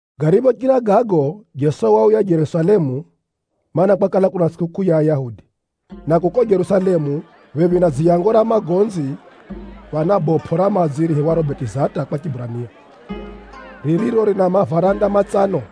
Gariphochira gago, Jeso wauya Jerusalemu, mana, kwakala kuna tsʼikukʼuu ya Ayahudi. Na kuko Jerusalemu, phephi na Dziyango ra Magonzi, phana bopʼo ra madzi riihiwaro Betizata kwa Chiburania, ririro rina mavaranda matsano.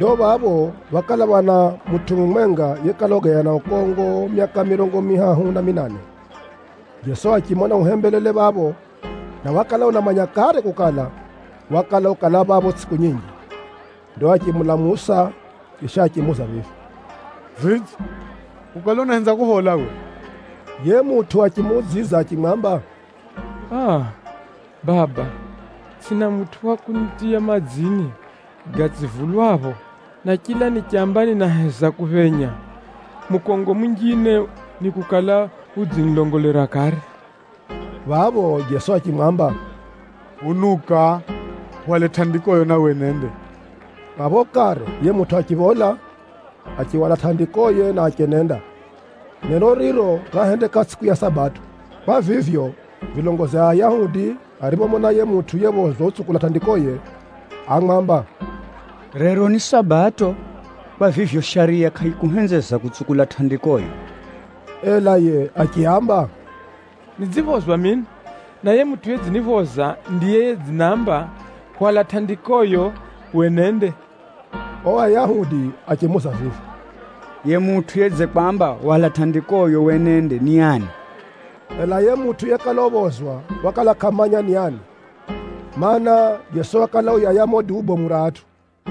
Ndo phapho phákala phana mutʼu mumwenga yekala ugaya na ukongo myaka mirongo mihahu na minane. Jeso achimona uhembelele phapho, na wakala unamanya kare kukala, wakala ukala phapho tsʼiku nyinji. Ndo achimulamusa, chisha achimuuza vivi, “Vidze, ukale unahenza kuphola uwe?” Yiye mutʼu achimuudzidza achimwamba, “Aa! Baba, tsʼina mutʼu wa kunitiya madzini gatsivulwapho, na chila nichamba ninaheza kuphenya, mukongo munjine nikukala udzinilongolera kare.” Phapho Jeso achimwamba vivi, “Unuka, uhwale tʼandikoyo na wenende.” Phapho kare yiye mutʼu achiphola, achihwala tʼandikoye na achenenda. Neno riro rahendeka tsʼiku ya Sabato. Kwa vivyo, vilongozi a Ayahudi ariphomona yiye mutʼu yephozwa utsukula tʼandikoye, ámwamba, “Rero ni Sabato, kwa vivyo, shariya kʼayikuhenzeza kutsukula tʼandikoyo.” Ela yiye achiaamba, “Nidziphozwa mino, na yiye mutʼu yedziniphoza ndiye yedzinamba, ‘Hwala tʼandikoyo wenende.’” Ao Ayahudi achimuuza vivi, “Yiye mutʼu yedzikwamba, ‘Hwala tʼandikoyo wenende,’ ni ani?” Ela yiye mutʼu yekala uphozwa wakala kʼamanya ni ani, mana, Jeso wakala uyaya mumo duu bomu ra atʼu.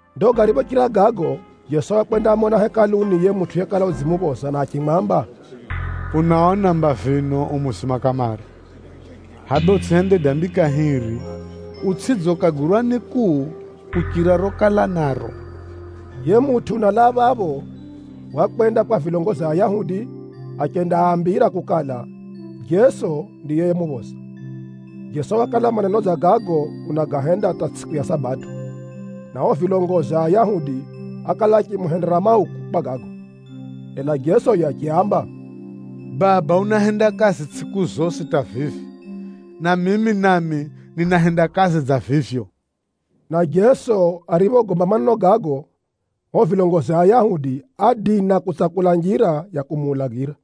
Ndo gariphochira gago, Jeso wakwendamona Hekaluni yiye mutʼu yekala udzimuphoza na achimwamba, “Unaona mba vino u muzima kamare, hʼaya bee utsʼihende dambi kahiri utsʼidze ukagwirwa ni kuu kuchira rokala naro.” Yiye mutʼu unalaa phapho, wakwenda kwa vilongozi a Ayahudi achendaambira kukala, Jeso ndiye yemuphoza. Jeso wakala maneno dza gago unagahenda hata tsʼiku ya Sabato, na ao vilongozi a Ayahudi ákala achimuhendera mauku kwa gago. Ela Jeso yiye achiaamba, “Baba unahenda kazi tsʼiku zosi hata vivi, na mimi nami ninahenda kazi dza vivyo.” Na Jeso ariphogomba maneno gago, ao vilongozi a Ayahudi ádina kutsakula njira ya kumuulagira.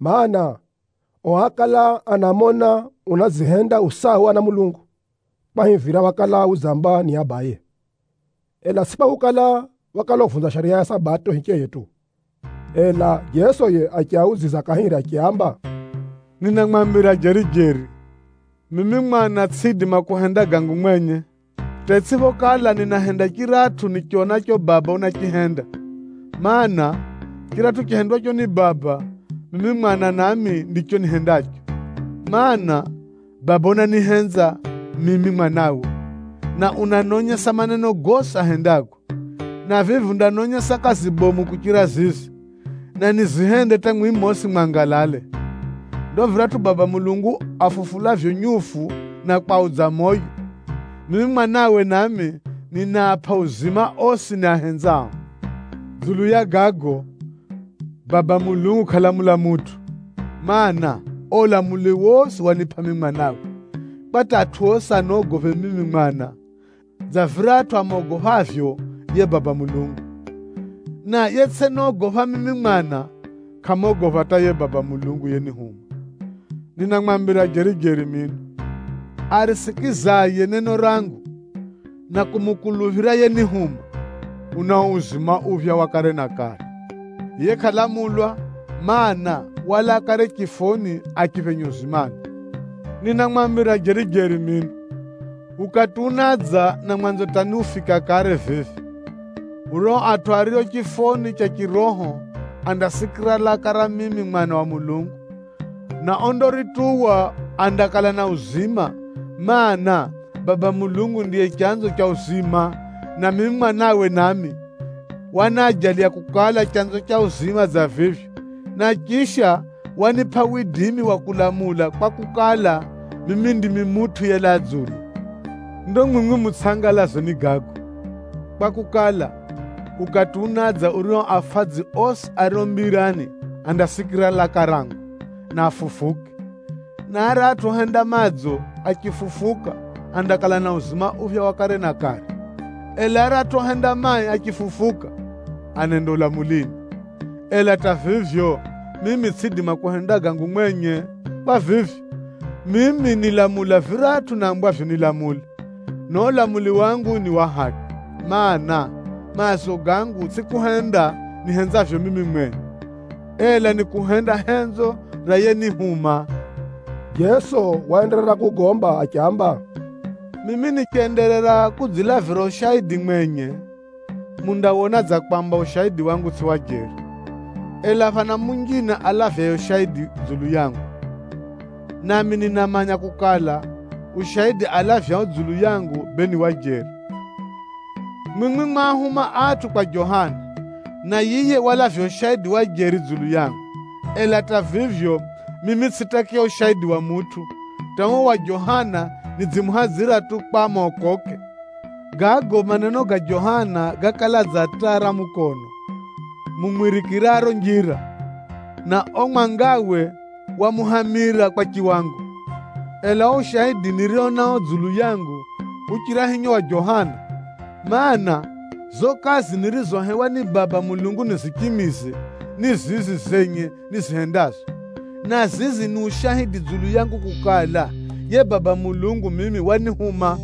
Maana, ao ákala anamona unadzihenda u sawa na Mulungu kwahivira wakala udzamba ni Abaye, ela tsʼi kwakukala, wakala uvunza shariya ya Sabato hicheye tu. Ela Jeso yiye achiaudzidza kahiri achiaamba, “Ninamwambira jeri-jeri, mimi Mwana tsʼiidima kuhenda gangu mwenye, hata itsʼiphokala ninahenda chiratʼu nichonacho Baba unachihenda. Maana, chiratʼu chihendwacho ni Baba, mimi Mwana nami ndicho nihendacho. Maana, Baba unanihenza mimi Mwanawe, na unanonyesa maneno gosi ahendago. Na vivi undanonyesa kazi bomu kuchira zizi, na nizihende hata mwimwi mosi mwangalale. Ndo viratʼu Baba Mulungu afufulavyo nyufu na kwaudza moyo, mimi Mwanawe nami, ninaapʼa uzima osi niahenzao. Dzulu ya gago, Baba Mulungu kʼalamula mutʼu, mana, ao ulamuli wosi wanipʼa mimi Mwanawe, kwa hata atʼu osi anogophe mimi Mwana, dza viratʼu amogophavyo yiye Baba Mulungu. Na yetsʼinogopha mimi Mwana, kʼamogopha hata yiye Baba Mulungu yenihuma. “Ninamwambira jeri-jeri mino, arisikizaye neno rangu, na kumukuluphira yenihuma, unao uzima uphya wa kare na kare. Yiye kʼalamulwa, mana, walaa kare chifoni achiphenya uzimani. Ninamwambira jeri-jeri mino, ukati unadza, na mwanzo hata ni ufika kare vivi, urio atʼu ario chifoni cha chiroho andasikira laka ra mimi Mwana wa Mulungu, na ondarituwa andakala na uzima. Maana, Baba Mulungu ndiye chanzo cha uzima, na mimi Mwanawe nami, wanaajaliya kukala, chanzo cha uzima dza vivyo. Na chisha, wanipʼa widimi wa kulamula kwakukala, mimi ndimi Mutʼu yelaa dzulu. Ndo mwimwi mutsʼangalazwe ni gago, kwakukala, ukati unadza urio afadzi osi ario mbirani andasikira laka rangu, na afufuke. Na aratʼu ohenda madzo, achifufuka andakala na uzima uphya wa kare na kare, ela aratʼu ohenda mai, achifufuka, anenda ulamulini. Ela hata vivyo, mimi tsʼiidima kuhenda gangu mwenye. Kwa vivyo, mimi nilamula viratʼu nambwavyo nilamule, na uo ulamuli wangu ni wa haki. Maana, maazo gangu tsʼi kuhenda nihenzavyo mimi mwenye, ela ni kuhenda henzo ra yenihuma.” Jeso waenderera kugomba achiamba, “Mimi nichenderera kudzilavira ushaidi mwenye, mundawona dza kwamba ushaidi wangu tsʼi wa jeri. Ela phana munjine alavyaye ushaidi dzulu yangu, nami ninamanya kukala, ushaidi alavyao dzulu yangu, bee ni wa jeri. Mwimwi mwaahuma atʼu kwa Johana, na yiye walavya ushaidi wa jeri dzulu yangu. Ela hata vivyo, mimi tsʼitakiya ushaidi wa mutʼu, hata uo wa Johana nidzimuhadzira tu kwa mokoke. Gago maneno ga Johana gákala dza taa ra mukono mumwirikiraro njira, na uo mwangawe wamuhamira kwa chiwango. Ela uo ushaidi nirio nao dzulu yangu, uchira hinyo wa Johana. Maana, zizo kazi nirizohewa ni Baba Mulungu nizichimize, ni zizi zenye nizihendazo, na zizi ni ushaidi dzulu yangu kukala, yiye Baba Mulungu mimi wanihuma.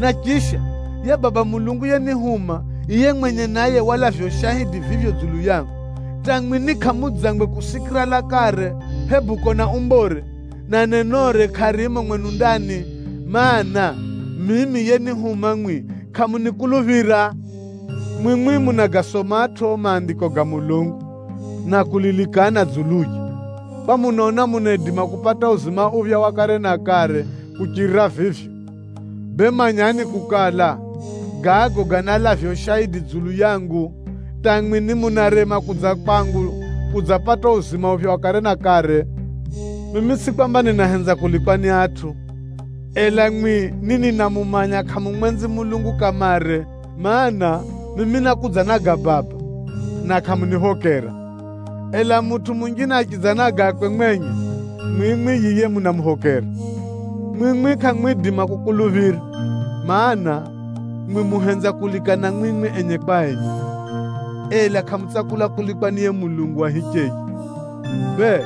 Na chisha, yiye Baba Mulungu yenihuma, yiye mwenye naye walavya ushaidi vivyo dzulu yangu, hata mwi ni kʼamudzangwe kusikira lakare, hebu kona umbore, na nenore kʼarimo mwenu ndani, mana, mimi yenihuma mwimwi kʼamunikuluphira. Mwimwi munagasomatʼo Maandiko ga Mulungu na kulilikana dzuluye, kwa munaona munaidima kupata uzima uphya wa kare na kare kuchirira vivyo. Bee manyani kukala, gago ganalavya ushaidi dzulu yangu, hata mwimwi ni munarema kudza kwangu kudzapata uo uzima uphya wa kare na kare. “Mimi tsʼi kwamba ninahenza kulikwa ni atʼu, ela mwimwi ni ninamumanya kʼamumwenzi Mulungu kamare. Maana, mimi nákudza na ga Baba, na kʼamuniphokera. Ela, mutʼu munjine achidza na gakwe mwenye, mwimwi yiye munamuphokera. Mwimwi kʼamwidima kukuluphira! Maana, mwimwi muhenza kulikana mwimwi enye kwa enye, ela kʼamutsakula kulikwa ni yiye Mulungu wa hicheye. Bee,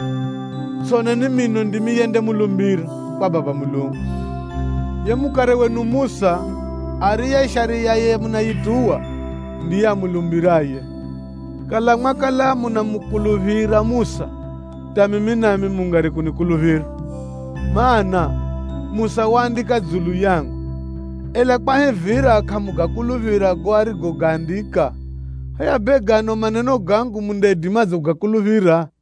tsʼoneni mino ndimi yendamulumbira kwa Baba Mulungu. Yiye mukare wenu Musa, ariye Shariyaye munayituwa, ndiye amulumbiraye. Kala mwakala munamukuluphira Musa, hata mimi nami mungari kunikuluphira, mana, Musa waandika dzulu yangu. Ela kwahivira kʼamugakuluphira gago arigogaandika, hʼaya bee gano maneno gangu mundaidimadze kugakuluphira?”